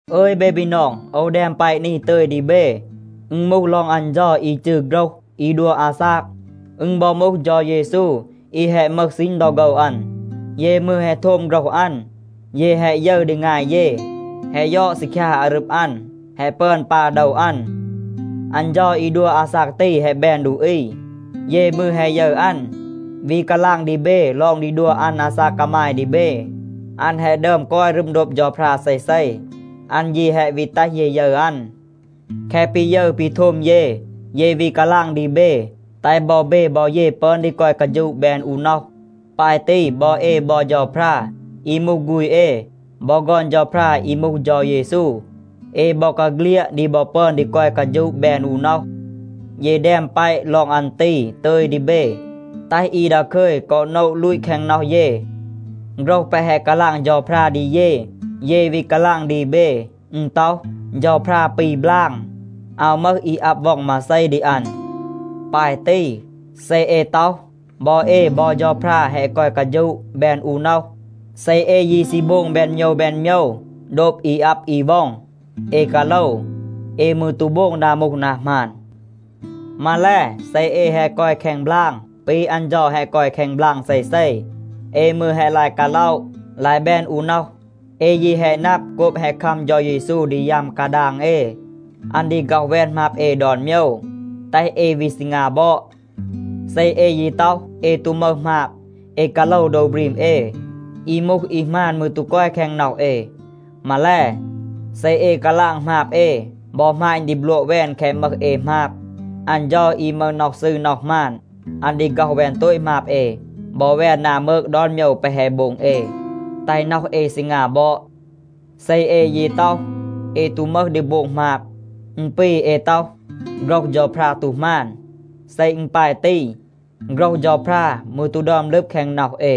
อึย เบ บีนอง, โอว แดม แปะ นี ตึย ดี เบ. อึณ มูห ลอง อัน เฌา อี จืร “โฆรห” อี ดัว อาซาก. อึณ บอ มูห เฌา เยซู อี แฮะ มึห ซีณ ดอ โฆว อัน. เย มืร แฮะ โทม โฆรห อัน. เย แฮะ ยึร ดี งาย เย, แฮะ ยอด ซีคยา อารึบ อัน, แฮะ ปึอน ปา โดว อัน. อัน เฌา อี ดัว อาซาก ตี แฮะ แบน ดูอี. เย มืร แฮะ ยึร อัน, วี กาลาง ดี เบ ลอง ดี ดัว อัน อาซาก กามาย ดี เบ. อัน แฮะ ดึอม กอย รึม โดบ เฌาพรา เซเซ, อัน ยี แฮะ วี แตห เย ยึร อัน. แคะ ปี ยึร ปี โทม เย, เย วี กาลาง ดี เบ, แตห บอ เบ บอ เย ปึอน ดี กอย กาฌูะ แบน อู น็อห. ปาย ตี บอ เอ บอ เฌาพรา อี มูห ฆูณ เอ บอ ฆอน เฌาพรา อี มูห เฌา เยซู, เอ บอกาเฆลียด ดี บอ ปึอน ดี กอย กาฌูะ แบน อู น็อห. เย แดม แปะ ลอง อัน ตี ตึย ดี เบ, แตห อี ดาคึย กอ โนะ ลูต แคง น็อห เย. โฆรห แปะ แฮะ กาลาง เฌาพรา ดี เย, เย วี กาลาง ดี เบ. อึณ ต็อห, เฌาพรา ปี บลาง. อาว มึห อี อับ ว็อง มาเซ ดี อัน. ปาย ตี, เซ เอ ต็อห, บอ เอ บอ เฌาพรา แฮะ กอย กาฌูะ แบน อู น็อห, เซ เอ ยี ซี โบง แบน โมยว แบน โมยว โดบ อี อับ อี ว็อง, เอ กาโลว. เอ มืร ตู โบง นา มูห นา หมาน. มาแล, เซ เอ แฮะ กอย แคง บลาง ปี อัน เฌา แฮะ กอย แคง บลาง เซเซ, เอ มืร แฮะ ลาย กาล็อะ, ลาย แบน อู น็อห. เอ ยี แฮะ นับ, โกบ แฮะ คัม เฌา เยซู ดี ยัม กาดาง เอ, อัน ดี ฆ็อห แวน หมาบ เอ ดอน โมยว, แตห เอ วี ซีงา บอด. เซ เอ ยี ต็อห, เอ ตู มึห หมาบ, เอ กาโลว โดว บรีม เอ. อี มูห อี หมาน มืร ตู กอย แคง น็อห เอ. มาแล, เซ เอ กาลาง หมาบ เอ บอ หมาณ ดี บลัวะ แวน แคะ มึห เอ หมาบ, อัน เฌา อี มึห น็อห ซืร น็อห หมาน, อัน ดี ฆ็อห แวน โตต หมาบ เอ บอ แวน นา มืก ดอน โมยว แปะ แฮะ โบง เอ, แตห น็อห เอ ซีงา บอด. เซ เอ ยี ต็อห, เอ ตู มึห ดี โบง หมาบ, อึณ ปี เอ ต็อห, โฆรห เฌาพรา ตู หมาน. เซ อึณ ปาย ตี, โฆรห เฌาพรา มืร ตู ดึอม ลึบ แคง น็อห เอ.